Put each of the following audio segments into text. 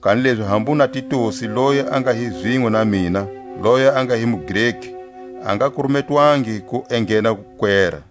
Kanilezi hambu na Titusi loyi a nga hi zinwe na mina, loyi a nga hi muGreki, a nga kurumetwangi ku enghena wukwera.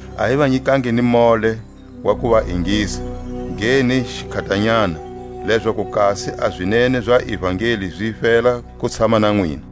A hi va nyikangi ni mole wa ku va ingisa, ge ni xikhatanyana; lezaku kasi a zinene za ivangeli zi fela ku tshama na nwina.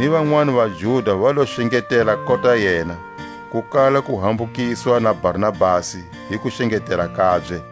Ni vanwani vaJuda va lo xengetela kota yena, ku kala ku hambukiswa na Barnabasi hi kuxengetela kabye.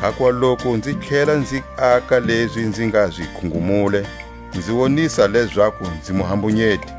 Hakuva loku nzi tlhela nzi aka lezi nzi nga zi khungumule, nzi wonisa lezaku nzi muhambunyeti.